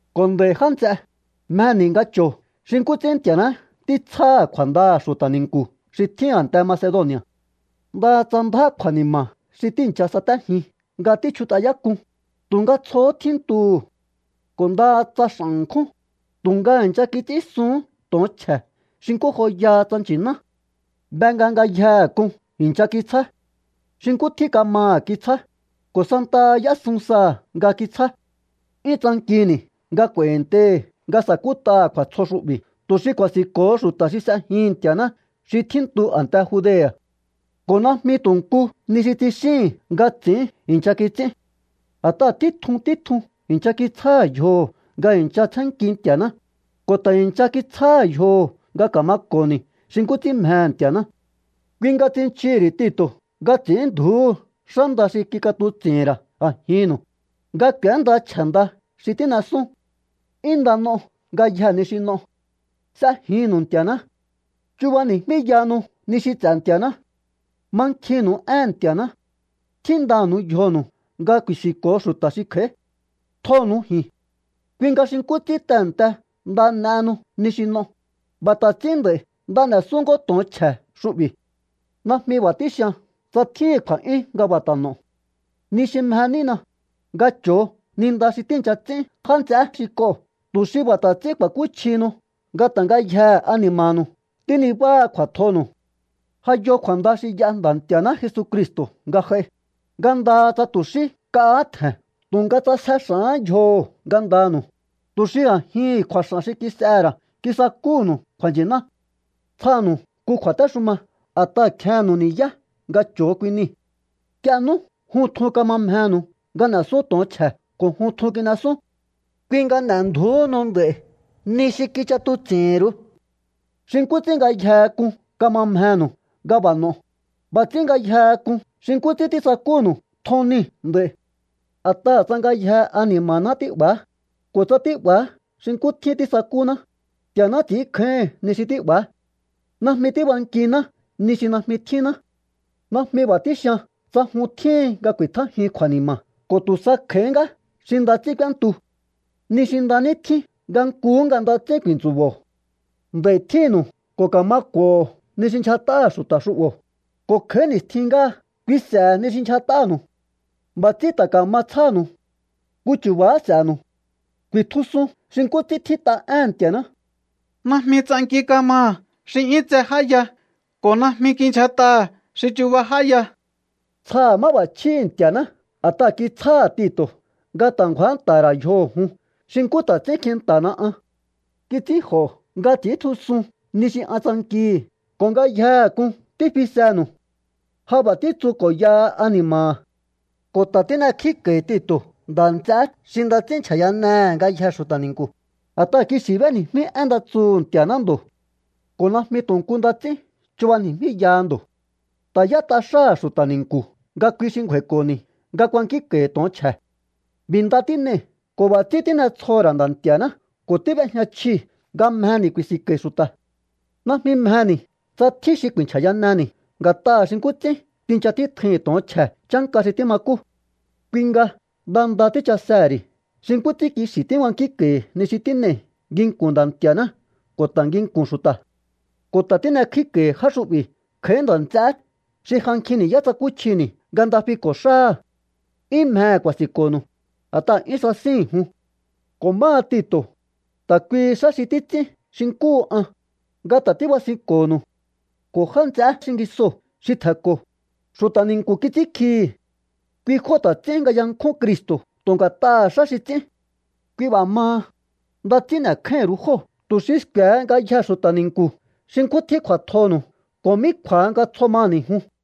Ko̱ nd'a̱i̱, já nts'e, mjeni̱ nga cho̱o xi nkú ts'ín Nti̱a̱ná títsjáha̱ kju̱a̱ndaha̱ xu̱ta̱ ni̱nku̱ xi tjín a̱nte Macedoni̱a̱. Ndaha tsa ndjá kju̱a̱ni̱ma̱ xi tíi̱ncha satéjin nga tíchjut'ayák'un, tu̱nga tsjohó tjíntuhu̱. Ko̱ ndaha tsa x'a̱n ṉkjún, tu̱nga i̱ncha kits'ínsuhún to̱on chje̱ xi nkú joyaha tsa nchi̱ná. Be nga ngayjehe k'un i̱ncha kitsjá. Xi nkú tjín kamaha̱ kitsjá, ko̱ santaha y'ésun saha̱ nga kitsjá. 'Yún tsankini̱ nga kj'u̱a̱i̱ntei̱hi̱ nga sa̱kút'aha̱ kju̱a̱tsjo xu'bi̱ tu̱ xi ku̱a̱si̱nko̱ho xu̱ta̱ xi s'ejihi̱n Nti̱a̱ná xi tjíntu a̱nte Judea̱. Ko̱ najmi tu̱ nku ni xi tsixíi̱n nga ts'i̱ín i̱ncha kits'ín. A̱t'aha̱ títjun títjun i̱ncha kitsjáha̱ yjoho̱ nga i̱ncha tsjénnki Nti̱a̱ná, ko̱ ta̱ i̱ncha kitsjáha̱ yjoho̱ nga ka̱mako̱ni̱ xi nkú ts'ín mjehe̱ Nti̱a̱ná. Kui nga tsinchii̱hi̱ ri̱ Tito̱ nga ts'i̱ínndju̱úhu xá nda xi kik'atuts'i̱hi̱n ra̱ a̱jinnu̱u, nga k'u̱énda chje̱ nda xi tín'esún. 'Yún nda n'o ngayjee̱ ni xi n'o. S'ejinnu̱u Nti̱a̱ná. Chubani̱jmíyahanu ni xi ts'e̱ Nti̱a̱ná. Mankjinnu̱u éhe̱n Nti̱a̱ná. Tjíndanu̱u yjonu̱u nga ku̱i̱si̱nko̱o xu̱ta̱ xi kj'a̱í. Tjonu̱u ji̱n. Kui nga xi nkú ts'ín tehe̱nte nda n'ehenu ni xi n'o, b'a̱ ta̱ ts'ín nd'a̱i̱ nda n'e̱sún ngó to̱on chje̱ xu'bi̱. Najmi b'a̱ tíxian tsa tjíhi̱n kju̱a̱'yún nga b'a̱ ta̱ n'o̱o. Ni xi mje nína, nga cho̱o ni nda xi tíi̱ncha ts'ín já nts'eé xi k'oo̱ tu̱ xi b'a̱ ta̱ ts'ín ku̱a̱kúchjihinu nga ta̱ ngayjee̱ ani̱ma̱nu̱u tínibáha kju̱a̱tjonu̱u. Ja yo kju̱a̱nda xi y'a Nda̱ Nti̱a̱ná Jesucristo̱ nga j'ai, nga ndaha tsa tu̱ xí nk'ahá tje̱n tu̱nga ts'asje x'a̱hán yjoho̱ ngandanu̱u, tu̱ xi a̱jihi̱n kju̱a̱x'a̱n xi kis'ehe̱ ra̱ kisakúhu̱nu̱u kju̱a̱nchi̱ná. Tsjanu̱u nku kju̱a̱téxuma a̱t'aha̱ kjennu̱u ni̱yá nga cho̱o kui nii̱. Nk'ie nú jun tjun kama mjenu̱u nga n'e̱sún to̱on chje̱ ko̱ jun tjun kin'esún. Kui nga n'e̱ndju̱úhunu nd'a̱i̱ ni xi kich'atuts'i̱hi̱nru̱u. Xi nkú ts'ín ngayjehe k'un kama mjenu̱u nga b'a̱ n'o̱o, b'a̱ ts'ín ngayjehe k'un xi nkú ts'ín tísakúnu̱u tjon niu̱ nd'a̱i̱. A̱t'aha̱ tsa ngayjee̱ ani̱ma̱ná tí'ba̱á, ko̱ tsa tí'ba̱á xi nkú tjín tísakúná, Nti̱a̱ná ts'ínkjáíhi̱n ni xi tí'ba̱á. Najmi tíbankiná ni xi najmi tjínná. Najmi b'a̱ tíxian tsa jun tjíhin nga ku̱i̱tjájiun kju̱a̱ni̱ma̱ ko̱ tu̱ sa kj'a̱íhí ngá xi nda ts'ín k'úéntu. Ni xi nda ní tjín nga nkuhú nga nda ts'ín ku̱i̱ntsu̱bo̱o. Nd'a̱i̱ tjínnu̱u ko̱ ka̱ma k'u̱o̱ho̱ ni xi ndyjat'aha̱ xu̱ta̱ xu'bo̱, ko̱ kj'a̱í ni̱stjin ngáha kui s'e̱he̱ ni xi ndyjat'anu̱u. B'a̱ ts'ín ta̱ ka̱ma tsjánu̱u. Nku chu̱ba̱há s'e̱nu̱u. Ku̱i̱tjusun xi nkú ts'ín tjít'a éhe̱n Nti̱a̱ná: “Najmi ts'anki kamaha̱ xi 'yún tse j'áya ko̱ najmi kindyjat'aha̱ xi chuba j'áya.” Tsjaha̱ máb'a̱chjíhi̱ Nti̱a̱ná a̱t'aha̱ kitsjáha̱ Tito̱ nga ta̱ ngju̱ánta̱ha̱ ra̱ yjoho̱ jun xi nkú ta̱ ts'ín kjinta̱hana an. Kits'ínj'o̱ nga ts'i̱íntjusun ni xi an tsankihi̱ ko̱ ngayjehe k'un tífisenu̱u. Ja b'a̱ títsu ko̱yaha ani̱ma̱ha̱. Ko̱ ta̱ tín'ekjíko̱i̱ Tito̱ nda̱ nts'eé xi nda ts'ín nchja̱yanehe̱ ngayjee̱ xu̱ta̱ ni̱nku̱, a̱t'aha̱ kixi̱ b'éni̱jmí én nda tsuhu̱ Nti̱a̱ná ndo̱. Ko̱ najmi tu̱ nku nda ts'ín chubani̱jmíyaha ndo̱. Ta̱ y'ét'a xáha̱ xu̱ta̱ ni̱nku̱ nga kui xi ngju̱a̱i̱ko̱ni̱ nga kuankínko̱i̱ to̱on chje̱. B'i̱ nda tín'ei̱ ko̱ b'a̱ ts'ín tín'etsjoho̱ ra̱ Nda̱ Nti̱a̱ná ko̱ tíb'ejña chjii̱ nga mjeni̱ ku̱i̱si̱nko̱i̱ xu̱ta̱. Najmi mjeni̱ tsa tjín xi ku̱i̱nchja̱yaneni̱ nga̱t'aha̱ xi nkú ts'ín tincha títjui̱hi̱n to̱on chje̱ chánka xi tímakú. Kui nga nda nda tíchasehe̱ ri̱ xi nkú ts'ín kixi̱ tíbankínko̱i̱ ni xi tín'ei̱ nginku̱n Nda̱ Nti̱a̱ná ko̱ ta̱ nginku̱n xu̱ta̱. Ko̱ ta̱ tín'ekjíko̱i̱ já xu'bi̱ kj'a̱í nda̱ nts'eé xi ja nkjin ni̱yá tsakúchjini̱ nga nda fiko̱ xáha̱. 'Yún mjehe̱ ku̱a̱si̱nko̱nu̱u, a̱t'aha̱ 'yún sasíhi̱n jun. Ko̱ máha Tito̱, ta̱ kui xáha xi títs'ín xi nkúhu an, nga ta̱ tíbasinko̱nu̱u. Ko̱ já nts'eé xingisoo̱ xi tje̱nko̱, xu̱ta̱ ni̱nku̱ kits'ínkjihi̱. Kui jóo̱ ta̱ ts'ín nga yankjún Cristo̱ tu̱ nga̱t'aha̱ xá xi ts'ín. Kui b'a̱ maha, nda ts'ín n'e̱kjáíhi̱n ru̱u jóo̱ tu̱ xi sku̱e̱he ngayjee̱ xu̱ta̱ ni̱nku̱ xi nkú tjín kju̱a̱tjonu̱u ko̱ mí kju̱a̱ha nga tsjo maha̱ni̱ jun.